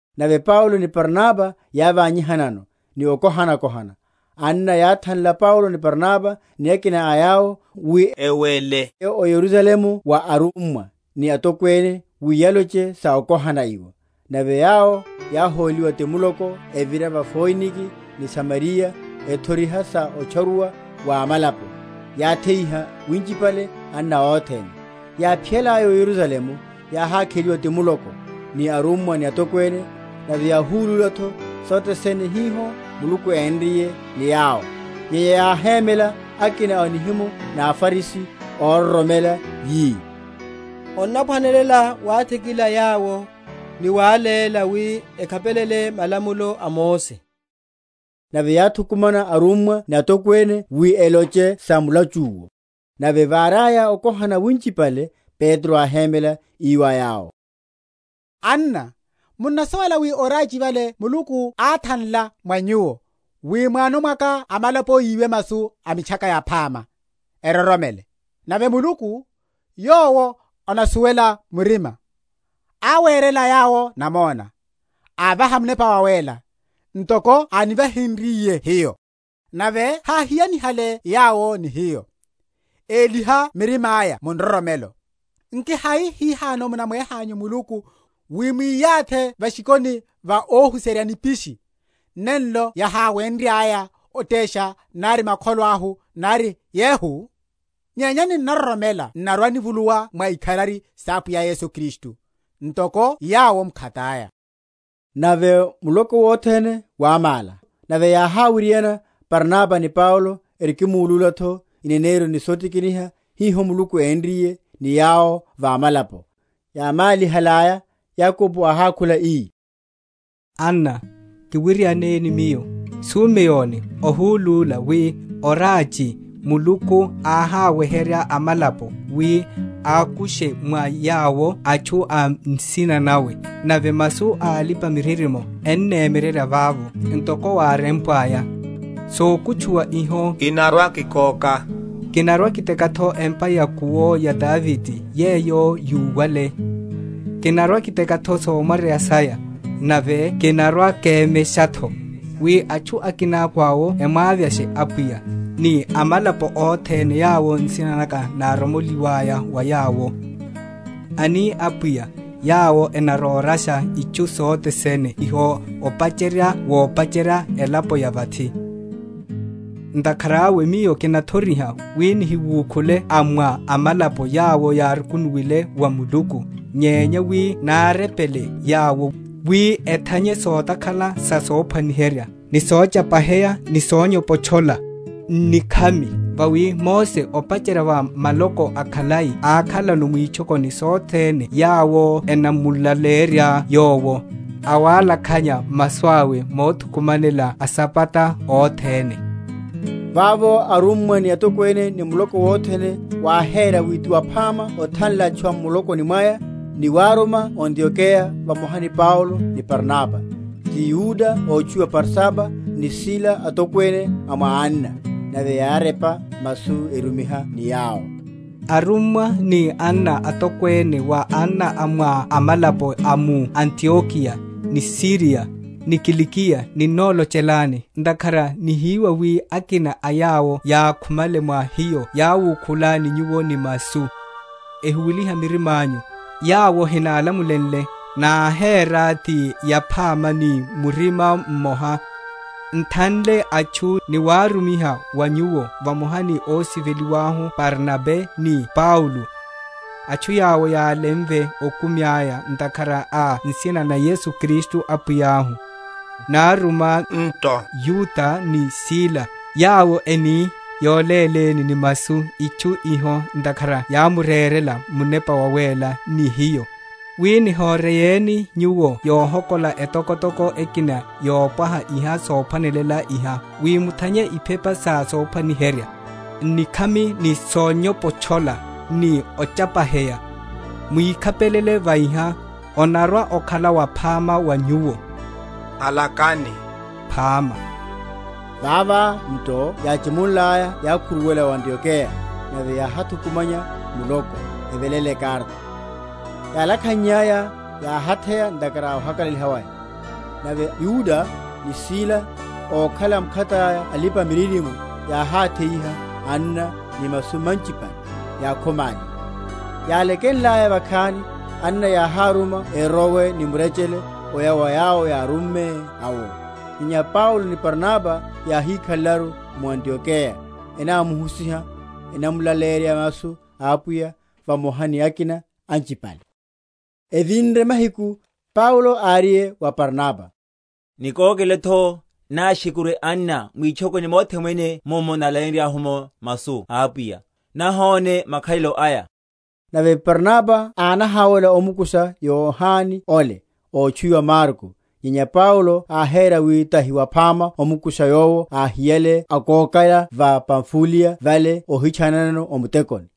Nave Paulo ni Barnaba yávanyihannayano ni okohanakohana, anna yáthanla Paulo ni Barnaba ni akina a yawo, wi ewele oya o Yerusalemu wa arummwa ni atokwene wi yaloche sa okohana iwo. Nave yawo yáhóliwa ti muloko, evira va Foinike ni Samariya, ethoriha sa otcharuwa wa amalapo; yatheiha winchipale anna othene. Yáphiyalaya o Yerusalemu, yáhákheliwa ti muloko, ni arummwa ni atokwene, nave yáhulúla’tho sothe sene hiho Muluku énriye ni yawo. Nyenya yáhemela akina a nihimo na aFarisi óroromela, yi, Onnaphwanelela wathikila yawo, ni wáléla wi ekhapelele malamulo a Mose. Nave yáthukumana arummwa ni atokwene wi eloche sa mulachu’wo. Nave váriaya okohana winchipale, Petro áhémela, ii wa yawo, Anna, munnasuwela wi orachi vale Muluku áthanla mwa nyuwo, wi m’wano mwaka amalapo yiwe masu a Mitchaka Yaphama, eroromele. Nave Muluku, yowo anasuwela murima, áwérela yawo namona; ávaha Munepa Wawéla, ntoko ánivahenryiye hiyo; nave háhiyanihale yawo ni hiyo, éliha mirima’ya mu nroromelo. Nki hai hihano munamwehanyu Muluku, wi mwiyathi va’shikhoni va óhuserya nipisi, nenlo yaháwenryaya otesha nari makholo ahu nari yehu? Nyenya ninnaroromela n’narwa‐nivuluwa mwa ikharari sa Apwiya Yesu Kristu, ntoko yawo m’khataya. Nave muloko wothene wámála; nave yáháwiriana Barnaba ni Paulo erikimulúla’tho ineneryo ni sotikiniha hiho Muluku énriye ni yawo va amalapo. Yámálihalaya Yakobo áhákhula, ii, Anna, kiwirianeni miyo: Sumeoni ohulúla wi orachi Muluku áháweherya amalapo, wi akushe mwa yawo atchu a nsina nawe. Nave masu a alipa‐miririmo ennemyererya vavo; ntoko wárempwaya, Sakutchuwa iho kinarwa‐kikoka, Kinarwa‐kiteka’tho empa ya’kuwo ya Davide, yeyo yuwale; Kinarwa‐kiteka’tho somwaryeya saya, Nave kinarwa‐kemesha’tho: Wi atchu akinako awo emwavyashe Apwiya, Ni amalapo othene yawo nsina naka náromoli?-?waya va yawo, Ani Apwiya, yawo enarorasha itchu sothe sene iho opacherya wopacherya elapo ya vathi. Ntakhara awe miyo kinathoriha, wi nihiwukhule a mwa amalapo yawo yárukunuwenle wa Muluku, nyenya wi nárepele yawo, wi ethanye sotakhala sa sophwaniherya, ni sochapaheya, ni sonyopotchola, n’nikhami. Vawi Mose, opacherya va maloko akhalai ákhalano mwitchokoni sothene yawo enamulaleya yowo, awalakhanya masu awe mothukumanela asabata othene. Vavo arummwa ni atokwene ni muloko wothene wáhéra wi ti yaphama othanla atchu a m’mulokoni mwaya, ni waruma o Antiokeya vamoha ni Paulo ni Barnaba; ti Yuda ótchuwiwa Barsaba, ni Sila, atokwene a mwa anna; nave yárepa masu erumiha ni yawo: Arummwa ni anna atokwene wa anna a mwa amalapo a mu Antiokeya, ni Suriya, ni Kilikiya ninnolochelani. Ntakhara nihiwa wi akina a yawo yákhumale mwa hiyo yáwukhulani nyuwo ni masu, ehuweliha mirima anyu; yawo hinálamulenle; náhéra ti yaphama ni murima mmoha, n’thanle atchu, ni waru?-?miha wa nyuwo vamoha ni ósiveliwa ahu Barnaba ni Paulo, atchu yawo yálemve okumi aya ntakhara a nsina na Yesu Kristu Apwiya ahu. Noruma nto Yuda ni Sila, yawo eni yoléléni ni masu itchu iho Ntakhara yámurerela Munepa Wawéla ni hiyo, wi nihoreyeni nyuwo yohokola etokotoko ekina yopwaha iha sophwanelela iha; wi muthanye iphepa sa sophwaniherya, n’nikhami, ni sonyopotchola, ni ochapaheya; mwikhapelela va iha, onarwa‐okhala waphama wa nyuwo. Halakani phama. Vava nto yáchimunlaya yákhuruwela o Antiokeya; nave yáhathukumanya muloko, eveléla ekarata. Yálakhannyaya, yáhatheya ntakhara a ohakalaliha waya. Nave Yuda ni Sila, ókhala mkhataya alipa‐miririmo yáhátheyiha anna ni masu manchipale, yákhomáliha. Yálekenlaya vakhani, anna yáháruma erowe ni murechele oya wa yawo yárumme awo. Nyenya Paulo ni Barnaba yáhikhalelaru mu Antiokeya, enámuhusiha, enámulaleyerya masu a Apwiya vamoha ni akina anchipale. Evinre mahiku, Paulo áriye wa Barnaba, Nikókele’tho náshekurye anna mwitchokoni mothe mwene mummo nálaleyenryahu’mo masu a Apwiya, nahóne makhalelo aya. Nave Barnaba ánahawela omukusha Yohane ole, ótchuwiwa Marko. Nyenya Paulo áhéra wi tahi waphama omukusha yowo áhiyale akókela va Pamfuliya vale óhitchananano o mutekoni.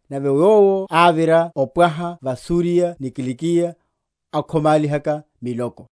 Nave yowo ávira opwaha va Suriya ni Kilikiya, akhomálihaka miloko.